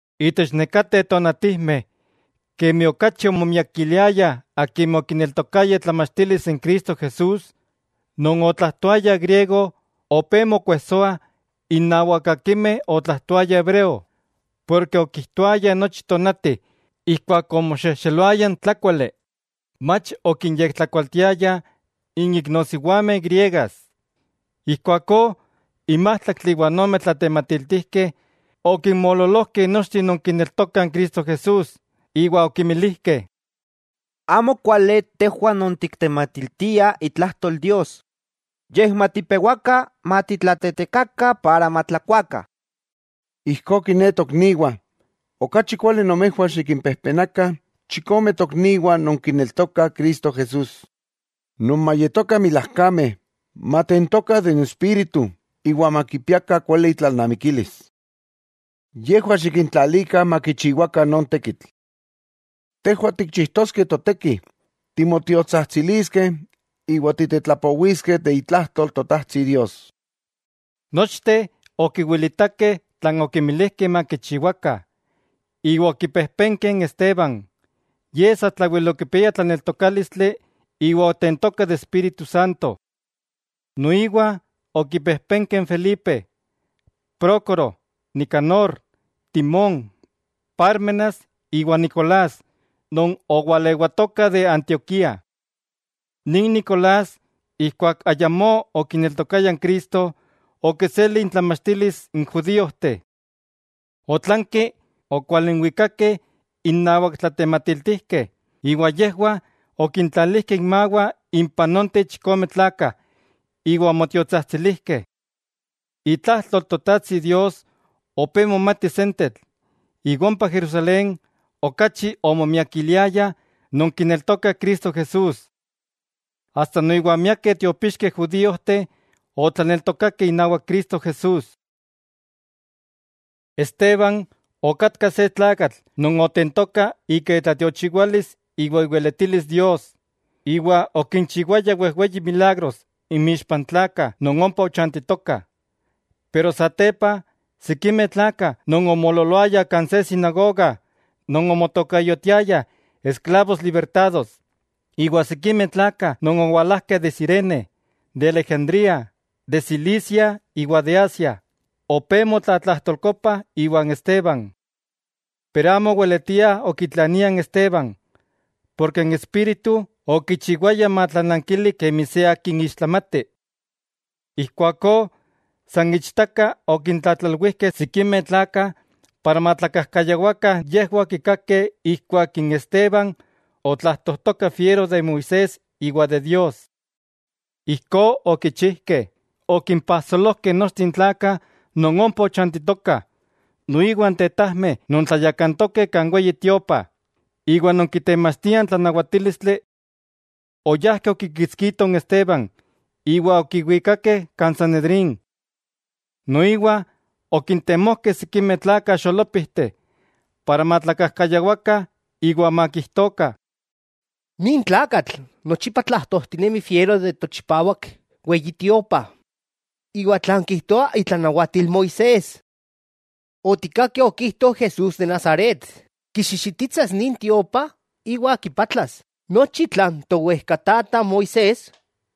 Itech nekateh tonatijmeh, kemi okachi omomiakiliayah akimeh okineltokayah itlamachtilis n Cristo Jesús non otlajtoayah griego opé mokuejsoah innawak akimeh otlajtoayah hebreo, porke okijtoayah nochi tonati ijkuak omoxejxeloaya n tlákuali, mach okinyektlakualtiayah n iknosiwameh griegas. Ijkuakó n májtlaktli iwa ome tlatematiltijkeh okinmoololojkeh nochteh non kineltokah Cristo Jesús, iwa okimilijkeh: —Amo kuali tejwah non tiktematiltiah itlajtol Dios, yej matipewakah matitlatetekakah para matlakuakah. Ijkó kiné tokniwah, okachi kuali nomejwah xikimpejpenakah chikome tokniwah non kineltokah Cristo Jesús, non mayetokah milajkameh, matentokah de n Espíritu iwa makipiakah kuali intlalnamikilis. Yejwah xikintlalikah makichiwakah non tekitl. 'Tejwah tikchijtoskeh toteki; timotiotsajtsiliskeh iwa titetlapowiskeh de itlajtol Totajtsi Dios. Nochteh okiwilitakeh tlan okinmilijkeh makichiwakah. Iwa okipejpenkeh n Esteban, ye satlawel okipiaya tlaneltokálistli iwa otentoka de Espíritu Santo. Noiwa okipejpenkeh n Felipe, Prócoro, Nicanor, Timón, Pármenas iwa Nicolás non owalewatoka de Antioquía. Nin Nicolás, ijkuak ayamó okineltokaya n Cristo, okiseli intlamachtilis n judíojteh. Otlanki okwalinwikakeh innawak tlatematiltijkeh, iwa yejwah okintlalijkeh inmawah impah nonteh chikome tlakah iwa omotiotsajtsilijkeh. Itlajtol Totajtsi Dios opé momati sentetl, iwa ompa Jerusalén okachi omomiakiliayah non kineltokah Cristo Jesús. Asta noiwa miakeh tiopixkeh judíojteh otlaneltokakeh inawak Cristo Jesús. Esteban okatka se tlakatl non otentoka ika itlatiochiwalis iwa iweletilis Dios; iwa okinchiwaya wejweyi milagros inmixpa n tlakah non ompa ochantitokah. Pero satepa, sikimeh tlakah non omoololoayah kan se sinagoga non omotokayotiayah Esklavos Libertados, iwa sikimeh tlakah non owalajkeh de Cirene, de Alejandría, de Cilicia iwa de Asia, opé motlatlajtolkopah iwan Esteban. Pero amo oweletiah okitlaniah n Esteban, porke n espíritu okichiwaya matlanankili kemi se akin ixtlamati. Ijkuakó san ichtaka okintlatlalwijkeh sikimeh tlakah para matlakajkayawakah yejwah okikakeh ijkuak Esteban otlajtojtoka fiero de Moisés iwa de Dios. Ijkó okichijkeh, okimpajsolojkeh nochteh n tlakah non ompa ochantitokah, noiwa n tetajmeh non tlayakantokeh kan Weyi Tiopa iwa non kitemachtiah n tlanawatílistli. Oyajkeh okikitskitoh n Esteban iwa okiwikakeh kan Sanedrín. Noiwa okintemojkeh sikimeh tlakah xolópijteh, para matlakajkayawakah iwa makijtokah: —Nin tlakatl nochipa tlajtojtinemi fiero de tochipawak Weyi Tiopa iwa tlan kijtoa itlanawatil Moisés. Otikkakeh okijto Jesús de Nazaret kixixititsas nin tiopa iwa kipatlas nochi tlan towejkatata Moisés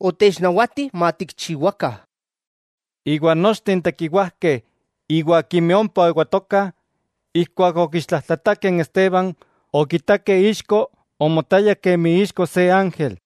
otechnawati matikchiwakah. Iwa nochteh n tekiwajkeh iwa akimeh ompa oewatokah, ijkuak okiixtlajtlatakeh n Esteban okitakeh ixko omotaya kemi ixko se ángel.